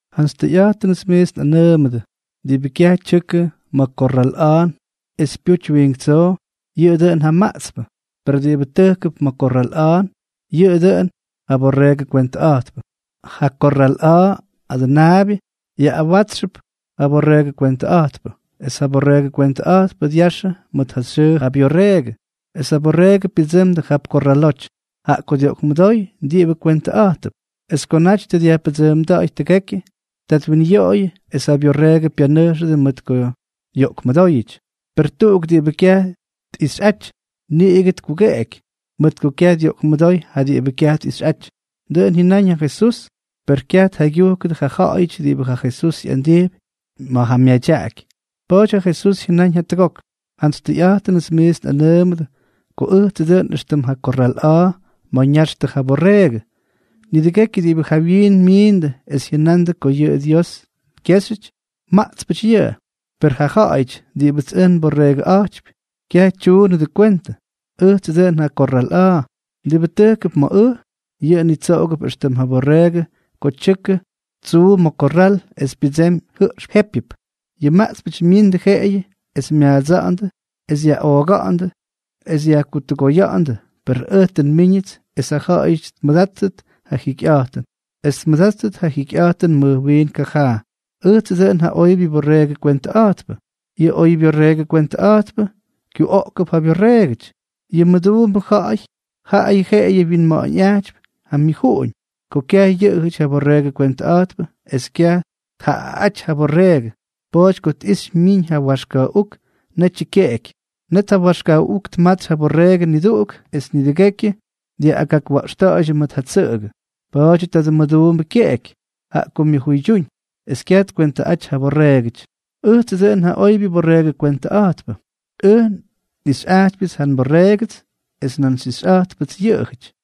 ’Jantsy tʉyꞌa̱jtʉnʉts miits nꞌanʉʉmʉdʉ, diꞌibʉ kyaj tyʉkʉ ma̱ korral a̱a̱n es pyuty wiink tsoo, yʉꞌʉ dʉꞌʉn ja maꞌtspʉ. Per diꞌibʉ tʉjkʉp ma̱ korral a̱a̱n, yʉꞌʉ dʉꞌʉn ja borreegʉ kwentʉꞌa̱jtpʉ. Ja korral a̱a̱ adʉnaabyʉ yaꞌꞌawátsxʉp ja borreegʉ kwentʉꞌa̱jtpʉ, es ja borreegʉ kwentʉꞌa̱jtpʉ dyaxʉ mʉt ja xyʉʉ ja byorreegʉ, esʉ borreegʉ pyʉdsʉmdʉ jap korraloty, jaꞌa ko dyoꞌkmʉdóy diꞌibʉ kwentʉꞌa̱jtʉp. Es ko naty tʉ dyajpʉdsʉʉmda̱ꞌa̱y tʉgekyʉ, ta twinyoꞌoyʉ, es ja byorreegʉ pyanʉjxʉdʉ mʉt ko yoꞌkmʉdóyʉty. Per tuꞌuk diꞌibʉ kyaj tꞌixyꞌaty, niꞌigʉ tkugeꞌeky, mʉt ko kyaj dyoꞌkmʉdóy ja diꞌibʉ kyaj tꞌixyꞌaty. Dʉꞌʉn jyʉnáñ ja Jesús, per kyaj tjaygyujkʉdʉ ja ja̱ꞌa̱yʉty diꞌibʉ ja Jesús ꞌyandijpy ma̱ ja myadyaꞌaky. Pa̱a̱ty ja Jesús jyʉnáñ jatʉgok: —Jantsy tʉyꞌa̱jtʉnʉts miits nꞌanʉʉmʉdʉ ko ʉjtsʉ dʉꞌʉn éxtʉm ja korral a̱a̱ ma̱ ña̱xtʉ ja borreegʉ. Nidʉgekyʉ diꞌibʉ jawyiin miindʉ es jyʉnandʉ ko yʉꞌʉ Dios kyéxyʉty, maꞌtspʉty yʉꞌʉ. Per ja ja̱ꞌa̱yʉty diꞌibʉts ʉj nborreegʉꞌa̱jtypy kyaj tyuunʉdʉ kwentʉ. Ʉjtsʉ dʉꞌʉn ja korral a̱a̱. Diꞌibʉ tʉjkʉp ma̱ ʉj, yʉꞌʉ nitsoꞌogʉp éxtʉm ja borreegʉ ko tyʉkʉ tsuu ma̱ kyorral es pyʉdsemy jʉꞌxpʉ jépyʉp. Yʉ maꞌtspʉty myindʉ jeꞌeyʉ es myaadsa̱ꞌa̱ndʉ es yaꞌooga̱ꞌa̱ndʉ es yajkutʉgoya̱ꞌa̱ndʉ, per ʉj tʉ nmíñʉts es ja ja̱ꞌa̱yʉty tmʉdáttʉt ja jikyꞌa̱jtʉn, es tmʉdáttʉt ja jikyꞌa̱jtʉn mʉj wiin kajaa. ’Ʉjtsʉ dʉꞌʉn ja oybyʉ borreegʉ kwentʉꞌa̱jtpʉ. Yʉ oybyorreegʉ kwentʉꞌa̱jtpʉ kyuꞌoogʉp ja byorreegʉty. Yʉ mʉduumbʉ jaꞌayʉ jeꞌeyʉ wyinma̱ꞌa̱ñꞌajtypy ja myʉjuꞌuñ. Ko kyaj yʉꞌʉjʉty ja borreegʉ kwentʉꞌa̱jtpʉ es kyaj tjaꞌaꞌáty ja borreegʉ, pa̱a̱ty ko tꞌixy myiñ ja waxka̱ꞌuk, netyʉ kyeꞌeky. Net ja waxka̱ꞌuk tmatsy ja borreegʉ niduꞌuk es nidʉgekyʉ dyaꞌꞌagakwa̱ꞌxta̱ꞌa̱ydyʉ mʉt ja tsʉꞌʉgʉ. Pa̱a̱dyʉ tadʉ mʉduumbʉ kyeꞌeky, jaꞌa ko myʉjuydyúñ, es kyaj tkwéntʉty ja borreegʉty. ’Ʉjtsʉ dʉꞌʉn ja oybyʉ borreegʉ kwentʉꞌa̱jtpʉ. Ʉj nꞌixyꞌajtypyʉts ja nborreegʉts es nan xyꞌixyꞌa̱jttʉpts yʉꞌʉjʉty,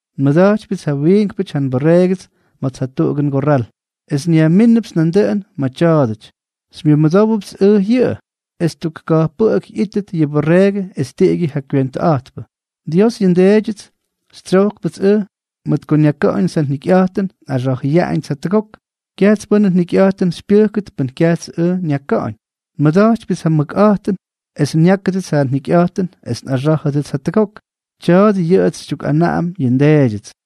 Nmʉda̱jtypyʉts ja wiinkpʉty ja nborreegʉts ma̱ts jatuꞌugʉ ngorral, es nyajmínʉpts nandʉꞌʉn ma̱ tya̱a̱dʉty. Xymyʉdówdupts ʉj yʉꞌʉ, es tuk kajpʉꞌʉk ꞌyítʉt yʉ borreegʉ es tiꞌigyʉ ja kwentʉꞌa̱jtpʉ. ’Dios, yʉ nDeedyʉts, xytsyojkpʉts ʉj mʉt ko nyaka̱ꞌa̱ñʉts ja njikyꞌa̱jtʉn es nꞌaxa̱jʉyaꞌañʉts jatʉgok. Kyajts pʉ́nʉ njikyꞌa̱jtʉn xypyʉjkʉt pʉn kyajts ʉj nyaka̱ꞌa̱ñ. Nmʉda̱jtypyʉts ja mʉkꞌa̱jtʉn es nyákʉdʉts ja njikyꞌa̱jtʉn es nꞌaxá̱jʉdʉts jatʉgok. Tya̱a̱dʉ yʉꞌʉts xytyukꞌanaꞌam yʉ nDeedyʉts.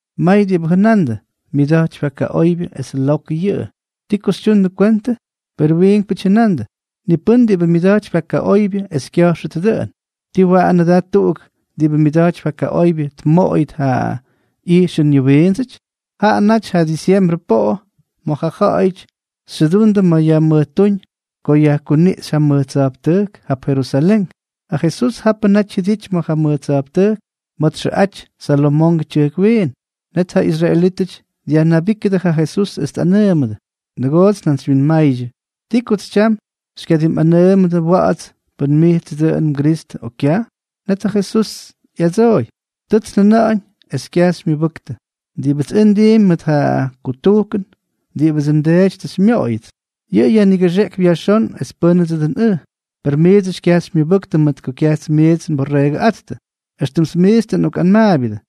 May diꞌibʉ jʉnandʉ: —Myʉda̱jtypy ja kaꞌoybyʉ es lokʉ yʉꞌʉ. ¿Ti ko xytyundʉ kwentʉ? Perʉ wiinkpʉty jʉnandʉ: —Ni pʉ́n diꞌibʉ myʉda̱jtypy ja kaꞌoybyʉ es kya̱jxʉt dʉꞌʉn. ¿Tii waꞌanʉ da tuꞌuk diꞌibʉ myʉda̱jtypy ja kaꞌoybyʉ tmoꞌoyʉt yʉ ꞌyijxʉn yʉ wiindsʉty? Jaꞌa naty ja disyembrʉ poꞌo ma̱ ja ja̱ꞌa̱yʉty xyʉdundʉ ma̱ yajmʉjtúñ ko yajkuniꞌxy ja mʉj tsa̱jptʉjk jap Jerusalén. Ja Jesús japʉ naty jyʉdity ma̱ ja mʉj tsa̱jptʉjk ma̱ txʉꞌaty Salomongʉ Tyʉjk Wiin. Net ja israelítʉty dyajnabíkʉdʉ ja Jesús es tꞌanʉʉmʉdʉ: —¡Nʉgoots njantsywyinmaydyʉ! ¿Ti kots tyam xykyadimꞌanʉʉmʉdʉ wa̱ꞌa̱ts pʉn mijtsʉ dʉꞌʉn mGristʉ, o kyaj? Net ja Jesús ꞌyadsooy: —Tʉts njajʉna̱ꞌa̱ñ, es kyaj xymyʉbʉktʉ. Diꞌibʉts ʉj ndiimpy mʉt ja kutujkʉn diꞌibʉdsʉ nDeety tʉ xymyoꞌoyʉts, yʉꞌʉ yajnigʉxeꞌkypy yajxón es pʉ́ndsʉ dʉn ʉj. Per miidsʉty kyaj xymyʉbʉktʉ mʉt ko kyajts miits nborreegʉꞌáttʉ. Extʉmts miits tʉ nꞌokꞌanmaabyʉdʉ,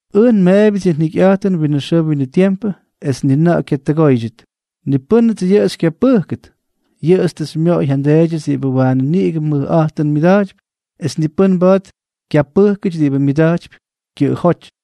Ʉj nmeebyʉts yʉ jikyꞌa̱jtʉn winʉ xʉʉ winʉ tiempʉ, es ni na̱ꞌa̱ kyatʉgóydyʉt; ni pʉ́nʉts yʉꞌʉ xykyapʉjkʉt. Yʉꞌʉts tʉ xymyoꞌoy ja nDeedyʉts diꞌibʉ waanʉ niꞌigʉ mʉjꞌa̱jtʉn tmʉdaty, es ni pʉ́n mba̱a̱t kyapʉjkxʉty diꞌibʉ myʉda̱jtypy kyʉꞌʉjóty.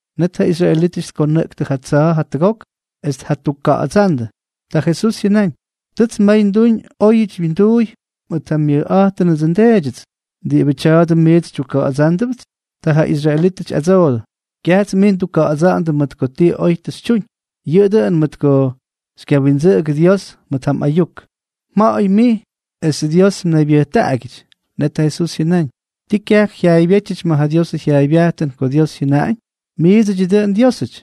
Net ja israelítʉty tkonʉꞌktʉ ja tsa̱a̱ jatʉgok es tjakuka̱ꞌa̱dsándʉ. Ta Jesús jyʉnáñ: —Tʉts may nduñ óyʉty mwinduuy mʉt ja myʉkꞌa̱jtʉnʉdsʉ nDeedyʉts. ¿Diꞌibʉ tya̱a̱dʉ miits xytyukkuka̱ꞌa̱dsándʉpts? Ta ja israelítʉty ꞌyadsoodʉ: —Kyajts mij ndukkuka̱ꞌa̱dsa̱ꞌa̱ndʉ mʉt ko ti oy tʉ xytyuñ, yʉꞌʉ dʉꞌʉn mʉt ko tʉ xykyawindsʉꞌʉgʉ Dios mʉt ja mꞌayuk. Mja̱ꞌa̱y mij, es Dios mnaybyʉjtaꞌagyʉty. Net ja Jesús jyʉnáñ: —¿Ti kyaj jyaaybyétyʉty ma̱ ja Diosʉ jyaaybyajtʉn ko Dios jyʉnáñ?: “Miidsʉdyʉ dʉꞌʉn diósʉty.”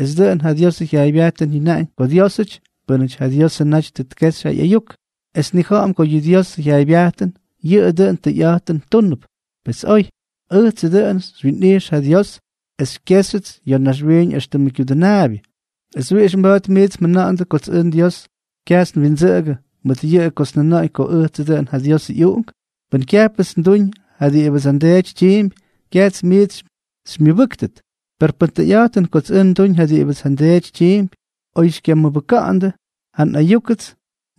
Es dʉꞌʉn ja Diosʉ jyaaybyajtʉn jyʉnáñ ko diósʉty pʉ́nʉty ja Diosʉ naty tʉ tkexy ja ꞌyayuk. Es nnija̱ꞌa̱m ko yʉ Diosʉ jyaaybyajtʉn yʉꞌʉ dʉꞌʉn tʉyꞌa̱jtʉn túnʉp. Pes oy. Ʉjtsʉ dʉꞌʉn xywyinꞌijx ja Dios es xykyejxyʉts ya̱ naxwiiñ éxtʉmʉ kyudʉnaabyʉ. ¿Es wiꞌix mba̱a̱t miits mjʉna̱ꞌa̱ndʉ kots ʉj Dios kyajts nwindsʉꞌʉgʉ mʉt yʉꞌʉyʉ kots njʉnáñ ko ʉjtsʉ dʉꞌʉn ja Diosʉ ꞌyUꞌunk? Pʉn kyajpʉts nduñ ja diꞌibʉdsʉ nDeety tyiimpy, kyajts miits xymyʉbʉ́ktʉt. Per pʉn tʉyꞌa̱jtʉn kots ʉj nduñ ja diꞌibʉts ja nDeety tyiimpy, oy xykyamʉbʉka̱ꞌa̱ndʉ ja nꞌayúkʉts,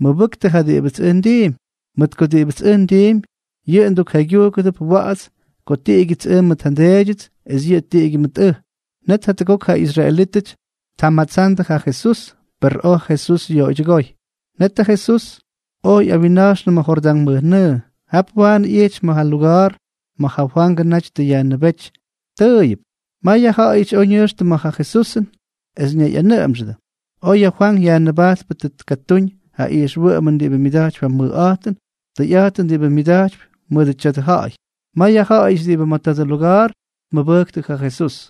mʉbʉktʉ ja diꞌibʉts ʉj ndiimpy, mʉt ko diꞌibʉts ʉj ndiimpy, yʉꞌʉ mdukjaygyúkʉdʉp wa̱ꞌa̱ts ko tiꞌigyʉts ʉj mʉt ja nDeedyʉts, es yʉꞌʉ tiꞌigyʉ mʉt ʉj. Net jatʉgok ja israelítʉty tjamatsandʉ ja Jesús, per oj ja Jesús yoꞌoydyʉgóy. Net ja Jesús oj ꞌyawinna̱jxnʉ ma̱ Jordán mʉjnʉʉ. Jap waanʉ ꞌyijty ma̱ ja luga̱a̱r ma̱ ja Fwangʉ naty tʉ yajnʉbéty tʉʉyʉp. May ja ja̱ꞌa̱yʉty oj ñʉjxtʉ ma̱ ja Jesusʉn, es ñayꞌanʉꞌʉmxʉdʉ: —Oy ja Fwank Yajnʉbajtpʉ tʉ tkatúñ ja ijxwʉꞌʉmʉn diꞌibʉ myʉda̱jtypy ja mʉjꞌa̱jtʉn, tʉyꞌa̱jtʉn diꞌibʉ myadyak mʉdʉ tya̱dʉ ja̱ꞌa̱y. May ja ja̱ꞌa̱yʉty diꞌibʉ ma̱ tadʉ luga̱a̱r tmʉbʉjktʉ ja Jesús.